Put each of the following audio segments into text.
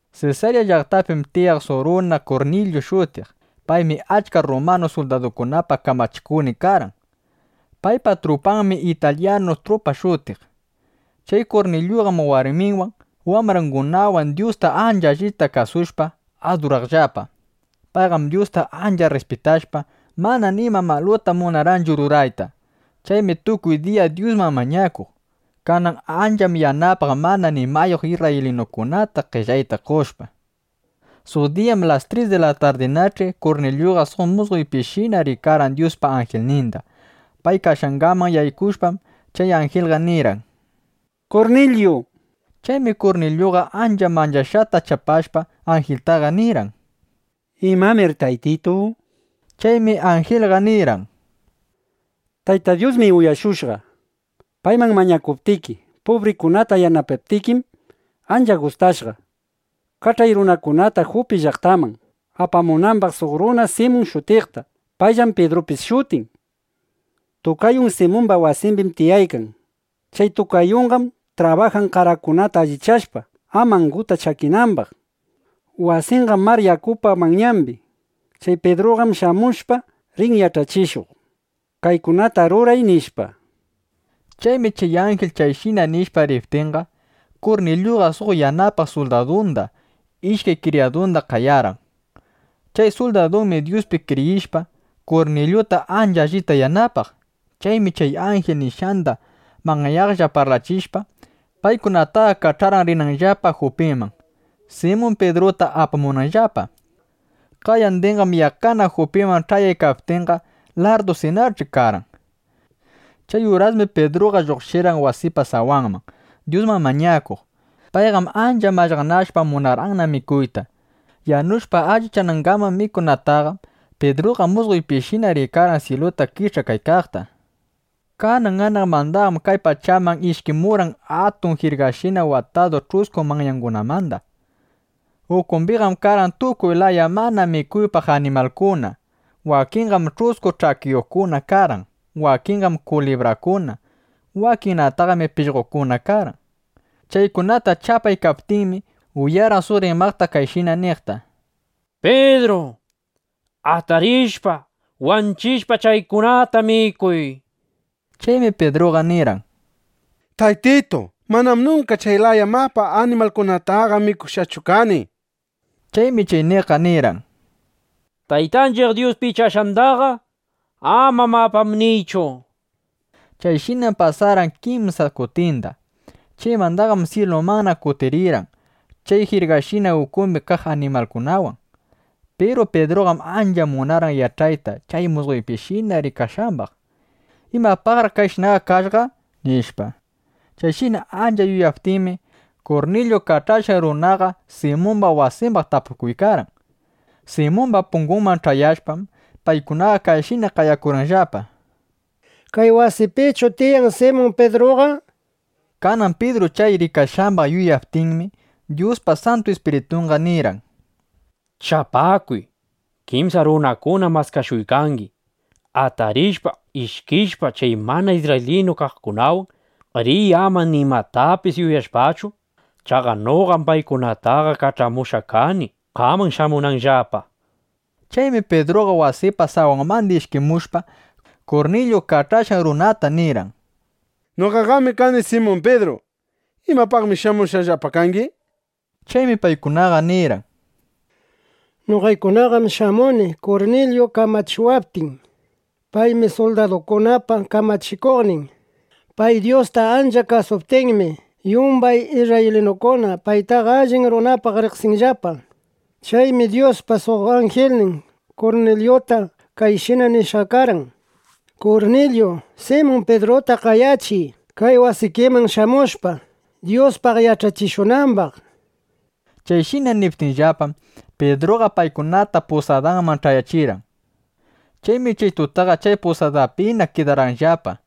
Sesarya llaqtapim tiyaq suq runa Kurnilyu shutiq. Paymi achka rrumanu suldadukunapa kamachikuqnin karqan. Paypa trupanmi Italyanu Trupa shutiq. Chay Kurnilyuqam warminwan, wambrangunawan Dyusta ancha allita kasushpa, aduraqllapa. Payqam Dyusta ancha rrispitashpa, mana nima maluta munarqanchu rurayta. Chaymi tukuy diya Dyusman mañakuq. Kanan ancham yanapaq mana nimayuq isrraylinukunata, qellayta qoshpa. Suq diyam las tris di la tarditach'i, Kurnilyuqa suq musqoypishina rikarqan Dyuspa anjilninda. Pay kashqanman yaykushpam, chay anjilqa nirqan: —¡Kurnilyu! nishpa. Chaymi Kurnilyuqa ancha manchashqata chapashpa, anjiltaqa nirqan: —¿Imamir Taytitu? nishpa. Chaymi anjilqa nirqan: —Tayta Dyusmi uyashushqa, payman mañakuptiki. Pubrikunata yanapaptikim, ancha gustashqa. Kach'ay runakunata Jupi llaqtaman, apamunambaq suq runa Simun shutiqta. Payllam Pidrupis shutin. Tukayun Simumba wasimbim tiyaykan. Chay tukayunqam trabajan qarakunata allichashpa, ama anguta chakinambaq. Wasinqam mar yakupa manyambi. Chay Pidruqam shamushpa, rin yach'achishuq: “Kaykunata ruray”, nishpa. Chaymi chay anjil chayshina nishpa riptinqa, Kurnilyuqa suq yanapaq suldadunda, ishkay kriyadunda qayarqan. Chay suldadunmi Dyuspi kriyishpa, Kurnilyuta ancha allita yanapaq. Chaymi chay anjil nishqanda manyaqlla parlachishpa, paykunataqa kach'arqan rinanllapa Jupiman, Simun Pidruta apamunanllapa. Qayandinqam yaqqana Jupiman ch'ayaykaptinqa, larrdusinach'i karqan. Chay urasmi Pidruqa lluqshirqan wasipa sawanman, Dyusman mañakuq. Payqam ancha mallaqnashpa, munarqanna mikuyta. Yanushpa allichanangaman mikunataqa, Pidruqa musqoypishina rikarqan syiluta kich'akaykaqta. Kanan anaqmandam kay pachaman ishkimurqan atun jirgashina, watadu ch'usku manyangunamanda. Ukumbiqam karqan tukuy laya mana mikuypaq animalkuna: wakinqam ch'usku ch'akiyuqkuna karqan; wakinqam kulibrakuna; wakinnataqmi pishqokuna karqan. Chaykunata chapaykaptinmi, uyarqan suq rimaq kayshina niqta: —Pidru, atarishpa, wanchishpa, chaykunata mikuy, nishpa. Chaymi Pidruqa nirqan: —Taytitu, manam nunka chay laya mapa animalkunataqa mikushqachu kani, nishpa. Chaymi chay niqqa nirqan: —Taytanchiq Dyus pichashqandaqa, ama “mapam” niychu, nishpa. Chayshinam pasarqan kimsa kutinda. Chaymandaqam syilumanna kutirirqan chay jirgashina ukumbi kaq animalkunawan. Piru Pidruqam ancha munarqan yach'ayta chay musqoypishina rikashqambaq: ¿Imapaqraq chayshinaqa kashqa? nishpa. Chayshina ancha yuyaykaptinmi, Kurnilyu kach'ashqan runakunaqa Simumba wasimbaq tapukuykarqan. Simumba pungunman ch'ayashpam, paykunaqa kayshina qayakurqanllapa: —¿Kay wasipichu tiyan Simun Pidruqa? nishpa. Kanan Pidru chay rikashqambaq yuyaykaptinmi, Dyuspa Santu Ispiritunqa nirqan: —Chapakuy. Kimsa runakunam maskashuykangi. Atarishpa, ishkishpa, (chay mana isrraylinu kaqkunawan) riy, ama nimatapis yuyashpachu. Chaqa noqam paykunataqa kach'amushqa kani, qaman shamunanllapa, nishpa. Chaymi Pidruqa wasipa sawanmanda ishkimushpa, Kurnilyu kach'ashqan runakunata nirqan: —Noqam kani Simun Pidru. ¿Imapaqmi shamushqallapa kangi? nishpa. Chaymi paykunaqa nirqan: —Noqaykunaqam shamuni, Kurnilyu kach'amuwaptin. Paymi suldadukunapa kamachikuqnin. Pay Dyusta ancha kasuptinmi, yumbay isrraylinukuna paytaqa allin runapaq riqsinllapa. Chaymi Dyuspa suq anjilnin Kurnilyuta kayshina nishqa karqan: “Kurnilyu, Simun Pidruta qayachiy, kay wasikiman shamushpa, Dyuspaq yach'achishunambaq”, nishpa. Chayshina niptinllapam, Pidruqa paykunata pusadanman ch'ayachirqan. Chaymi chay tutaqa chay pusadapina kidarqanllapa.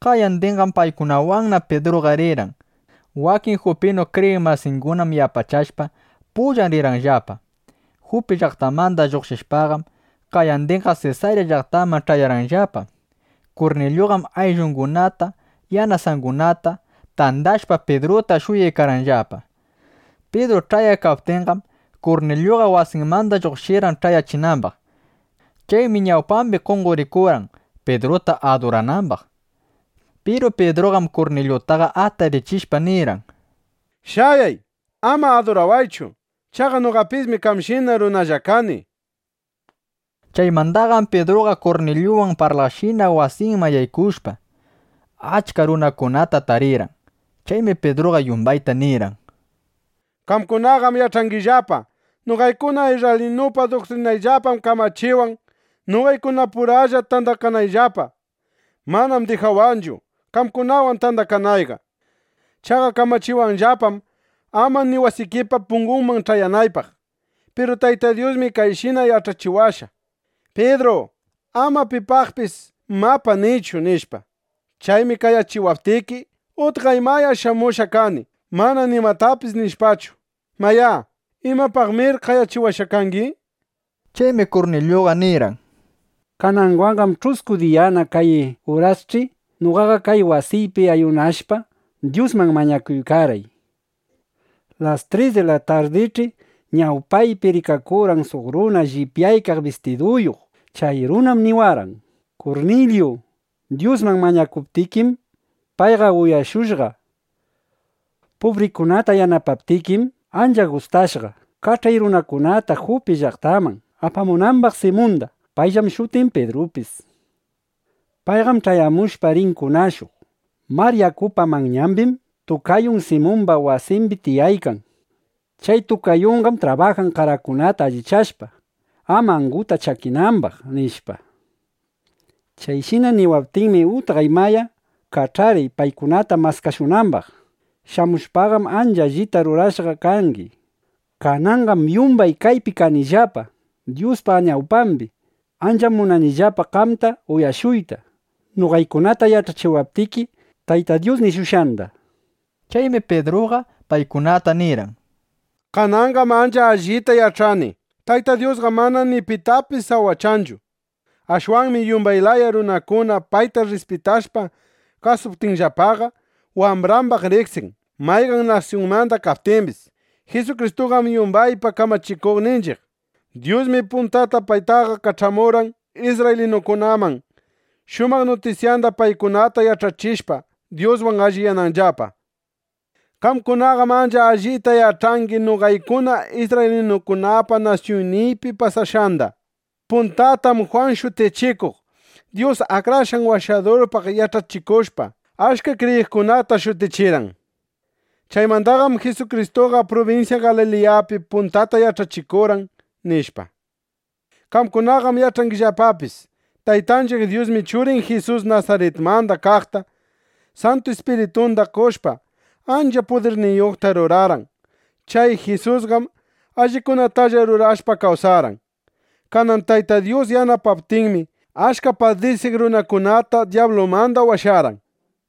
Qayandinqam paykunawanna Pidruqa rirqan. Wakin jupinu kriyiq masingunam yapachashpa, pullan rirqanllapa. Jupi llaqtamanda lluqshishpaqam, qayandinraq Sesarya llaqtamanqa ch'ayarqanllapa. Kurnilyuqam ayllungunata, yanasungunata (yanasangunata) tandashpa, Pidruta shuyaykarqanllapa. Pidru ch'ayaykaptinqam, Kurnilyuqa wasinmanda lluqshirqan ch'ayachinambaq. Chaymi ñawpambi qonqorikurqan, Pidruta aduranambaq. Piru Pidruqam Kurnilyutaqa atarichishpa nirqan: —Shayay. Ama adurawaychu. Chaqa noqapismi qamshina runalla kani, nishpa. Chaymandaqam Pidruqa Kurnilyuwan parlaqshina, wasinman yaykushpa, achka runakunata tarirqan. Chaymi Pidruqa yumbayta nirqan: —Qamkunaqam yach'angillapa, noqaykuna isrraylinupa duktrinayllapam kamachiwan, noqaykunapuralla tandakanayllapa. Manam dijawanchu, qamkunawan tandakanayqa. Chaqa kamachiwanllapam, ama ni wasikipa pungunman ch'ayanaypaq. Piru Tayta Dyusmi kayshina yach'achiwashqa: “Pidru, ama pipaqpis ‘mapa’, niychu”, nishpa. Chaymi qayachiwaptiki, utqay maya shamushqa kani, mana nimatapis nishpachu. Mayá, ¿imapaqmir qayachiwashqa kangi? nishpa. Chaymi Kurnilyuqa nirqan: —Kananwanqam ch'usku diyana kay urasch'i noqaqa kay wasiypi ayunashpa, Dyusman mañakuykarqay. Las tris di la tardich'i ñawpaypi rikakurqan suq runa llipyaykaq bistiduyuq. Chay runam niwarqan: “Kurnilyu, Dyusman mañakuptikim, payqa uyashushqa. Pubrikunata yanapaptikim, ancha gustashqa. Kach'ay runakunata Jupi llaqtaman, apamunambaq Simunda. Payllam shutin Pidrupis. Payqam ch'ayamushpa, rin kunashuq. Mar yakupa manyambim tukayun Simumba wasimbi tiyaykan. Chay tukayunqam trabajan qarakunata allichashpa, ama anguta chakinambaq”, nishpa. Chayshina niwaptinmi, utqay maya kach'arqay paykunata maskashunambaq. Shamushpaqam ancha allita rurashqa kangi. Kananqam yumbay kaypi kanillapa Dyuspa ñawpambi. Ancham munanillapa qamta uyashuyta, noqaykunata yach'achiwaptiki Tayta Dyus nishushqanda, nishpa. Chaymi Pidruqa paykunata nirqan: —Kananqam ancha allita yach'ani: Tayta Dyusqam mana ni pitapis sawachanchu. Ashwanmi yumbay laya runakuna payta rrispitashpa kasuptinllapaqa, wambrambaq riqsin, mayqan nasyunmanda kaptimbis. Jisukristuqam yumbaypa Kamachikuqninchiq. Dyusmi puntata paytaqa kach'amurqan isrraylinukunaman, shumaq nutisyanda paykunata yach'achishpa, Dyuswan alliyananllapa. Qamkunaqam ancha allita yach'angi noqaykuna isrraylinukunapa nasyunniypi pasashqanda. Puntatam Jwan Shutichikuq Dyus Akrashqan Washadurpaq yach'achikushpa, achka kriyiqkunata shutichirqan. Chaymandaqam Jisukristuqa prubinsya Galiliyapi puntata yach'achikurqan, nishpa. Qamkunaqam yach'angillapapis: Taytanchiq Dyusmi Churin Jisus Nasaritmanda kaqta Santu Ispiritunda qoshpa, ancha pudirniyuqta rurarqan. Chay Jisusqam allikunatalla rurashpa kawsarqan. Kanan Tayta Dyus yanapaptinmi, achka padisiq runakunata dyablumanda washarqan, nishpa.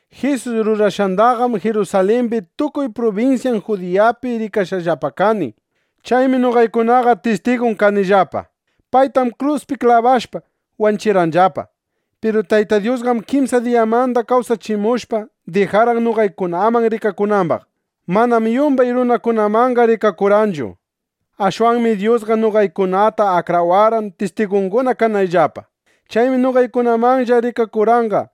Jisus rurashqandaqam Jirusalimbi, tukuy prubinsyan Judiyapi rikashqallapa kani. Chaymi noqaykunaqa tistigun kanillapa. Paytam kruspi klabashpa, wanchirqanllapa. Piru Tayta Dyusqam kimsa diyamanda kawsachimushpa, dijarqan noqaykunaman rikakunambaq. Manam yumbay runakunamanqa rikakurqanchu. Ashwanmi Dyusqa noqaykunata akrawarqan, tistigunguna kanayllapa. Chaymi noqaykunamanlla rikakurqanqa.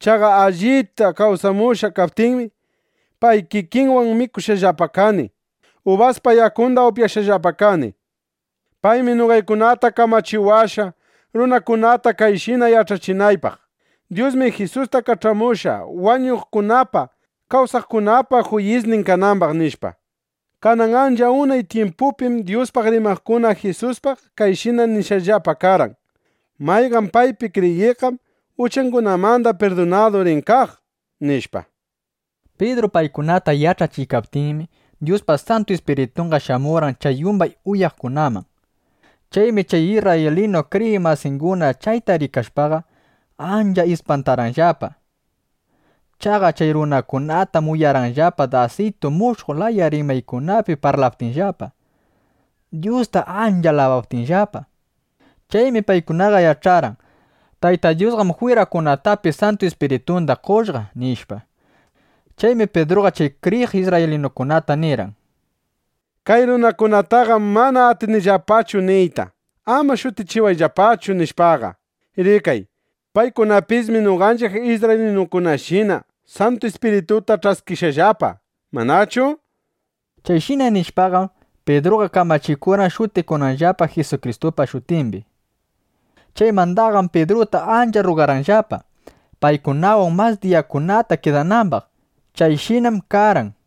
Chaqa allipta kawsamushqa kaptinmi, pay kikinwan mikushqallapa kani, (ubaspa yakunda) upyashqallapa kani. Paymi noqaykunata kamachiwashqa, runakunata kayshina yach'achinaypaq: “Dyusmi Jisusta kach'amushqa, wañuqkunapa, kawsaqkunapa juyisnin kanambaq”, nishpa. Kanan ancha unay tyimpupim Dyuspaq rimaqkuna Jisuspaq kayshina nishqallapa karqan: “Mayqan paypi kriyiqqam, uchangunamanda pirdunadu rin kaq”, nishpa. Pidru paykunata yach'achiykaptinmi, Dyuspa Santu Ispiritunqa shamurqan chay yumbay uyaqkunaman. Chaymi chay isrraylinu kriyiq masinguna chayta rikashpaqa, ancha ispantarqanllapa. Chaqa chay runakunatam uyarqanllapa dasitu mushuq laya rimaykunapi parlaptinllapa, Dyusta ancha alabaptinllapa. Chaymi paykunaqa yach'arqan: Tayta Dyusqam jwirakunatapis Santu Ispiritunda qoshqa, nishpa. Chaymi Pidruqa chay kriyiq isrraylinukunata nirqan: —Kay runakunataqam mana atinchiqllapachu niyta: “Ama shutikuyllapachu”, nishpaqa. Rikay, paykunapismi noqanchiq isrraylinukunashina Santu Ispirituta ch'askishqallapa, ¿manachu? nishpa. Chayshina nishpaqam, Pidruqa kamachikurqan, shutikunanllapa Jisukristupa shutimbi. Chaymandaqam Pidruta ancha rrugarqanllapa, paykunawan mas diyakunata kidanambaq. Chayshinam karqan.